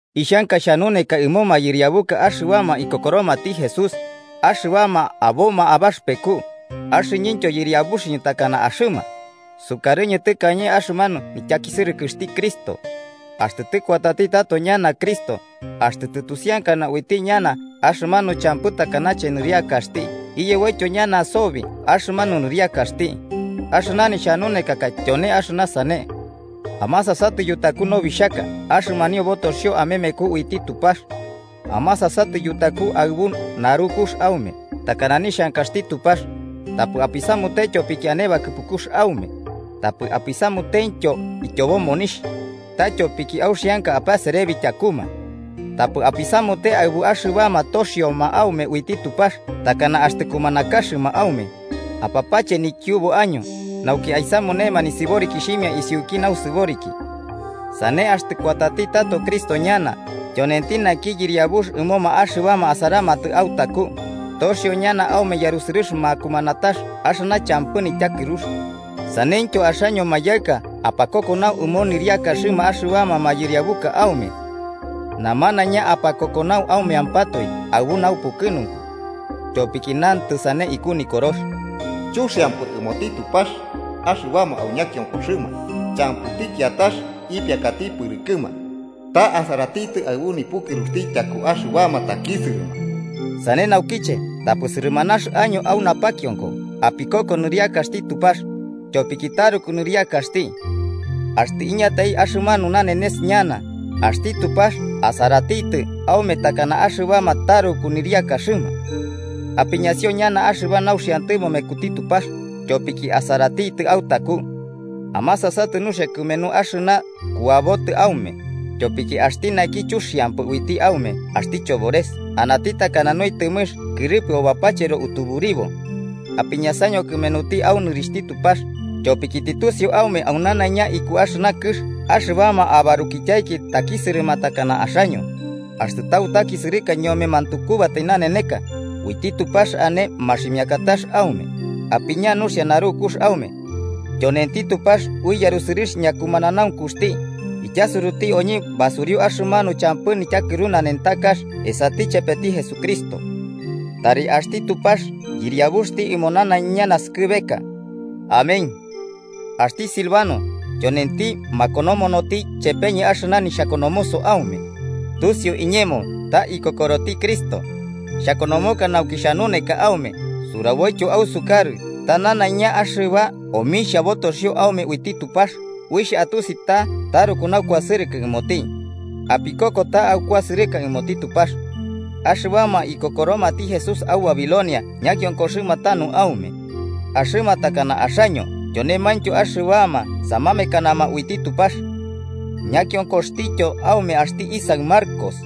Ixhanka xhanuneka ɨmo mayɨriabuka axɨbama ikokoromati Jesús, axɨbama aboma abaxɨpeku, axɨñɨntyo yɨriabuxɨñɨ takana axɨma, sukarɨñɨ tɨkañe axɨmanu nityakisɨrɨkɨxti Cristo. Axtɨ tɨkuatati tato ñana Cristo axtɨ tɨtusiankana uiti ñana axɨmanu champɨ takanache nɨriakaxti iyeboityo ñana sobi axɨmanu nɨriakaxti. Axɨna nixhanunekaka tyone axɨna sane. Amasasatɨ yutaku nobixhaka axɨmanio botoxio amemeku uiti Tupax. Amasasatɨ yutaku aɨbu narukux aume takana nixhankaxti Tupax, tapɨ apisamute tyopiki ane bakɨpukux aume, tapɨ apisamutentyo ityobo monixh, ta tyopiki auxianka apaserebi tyakuma. Tapɨ apisamute aɨbuma axɨbama toxioma aume uiti Tupax takana axtɨ kumanakaxɨma aume, apapache nikiubu año nauki aisamunema nisɨborikixhimia isiuki nausɨboriki. Sane axtɨ kuatati tato Cristo ñana, tyonenti naki yɨriabux ɨmoma axɨbama asaramatɨ autaku, toxio ñana aume yarusɨrɨx makumanatax axɨna champɨ nityakɨrux. Saneityo axaño mayaɨka, apakokonau ɨmo nɨriakaxɨma axɨbama mayɨriabuka aume. Namanaiña apakokonau aumeampatoe aɨbu naupukɨnunku. Tyopiki nantɨ sane iku Nikorox: “Chuxiampɨ ɨmoti Tupax axɨbama au ñakionkoxɨma champɨti kiatax ipiakati pɨrɨkɨma, ta asaratitɨ aɨbu nipukɨruxti tyakuma axɨbama takisɨrɨma.” Sane naukiche, tapɨ sɨrɨmanax año au napakionko apikoko nɨriakaxti Tupax, tyopiki taruku nɨriakaxti. Axtɨ iñatai axɨmanu nanenes ñana, axti Tupax asaratitɨ aume takana axɨbama taruku nɨriakaxɨma. Apiñasio nanaiña axɨba nauxiantɨmo mekuti Tupax, tyopiki asaratitɨ autaku. Amasasatɨ nuxia kɨmenu axɨna kuabotɨ aume, tyopiki axti naki chuxiampɨ uiti aume axti chobores anati takana nuitɨmɨx kɨrɨpɨo bapachero utuburibo. Apiñasaño kɨmenuti au nɨrixhti Tupax, tyopiki tɨtusiu aume aunanaiña iku axɨna kɨx axɨbama abarukityaiki takisɨrɨma takana axaño. Axtɨ tautakisɨrɨka ñome mantukubatai naneneka, uiti Tupax ane maximiakatax aume, apiña nuxia narukux aume. Tyonenti Tupax ui yarusɨrɨx ñakumananaunkuxti ityasuruti oñɨ basuriu axɨmanu champɨ nityakɨru nanentakax esati chepeti Jesucristo. Tari axti Tupax Yɨriabuxti ɨmo nanaiña naskɨbeka. Amén. Axti Silvano, tyonenti makonomonoti chepeñɨ axɨna nixhakonomoso aume. Tusiu iñemo ta ikokoroti Cristo. Xhakonomoka nauki xhanuneka aume suraboityo ausukarɨ ta nanaiña axɨba omixhia botoxio aume uiti Tupax uixh atusi ta taruku naukuasɨrɨkɨ ɨmoti. Apikoko ta aukuasɨrɨka ɨmoti Tupax. Axɨbama ikokoromati Jesús au Babilonia ñakiokoxɨma tanu aume. Axɨma takana axaño tyonemaintyo axɨbama samamekanama uiti Tupax. Ñakionkoxtiyo aume axti isaɨ Marcos.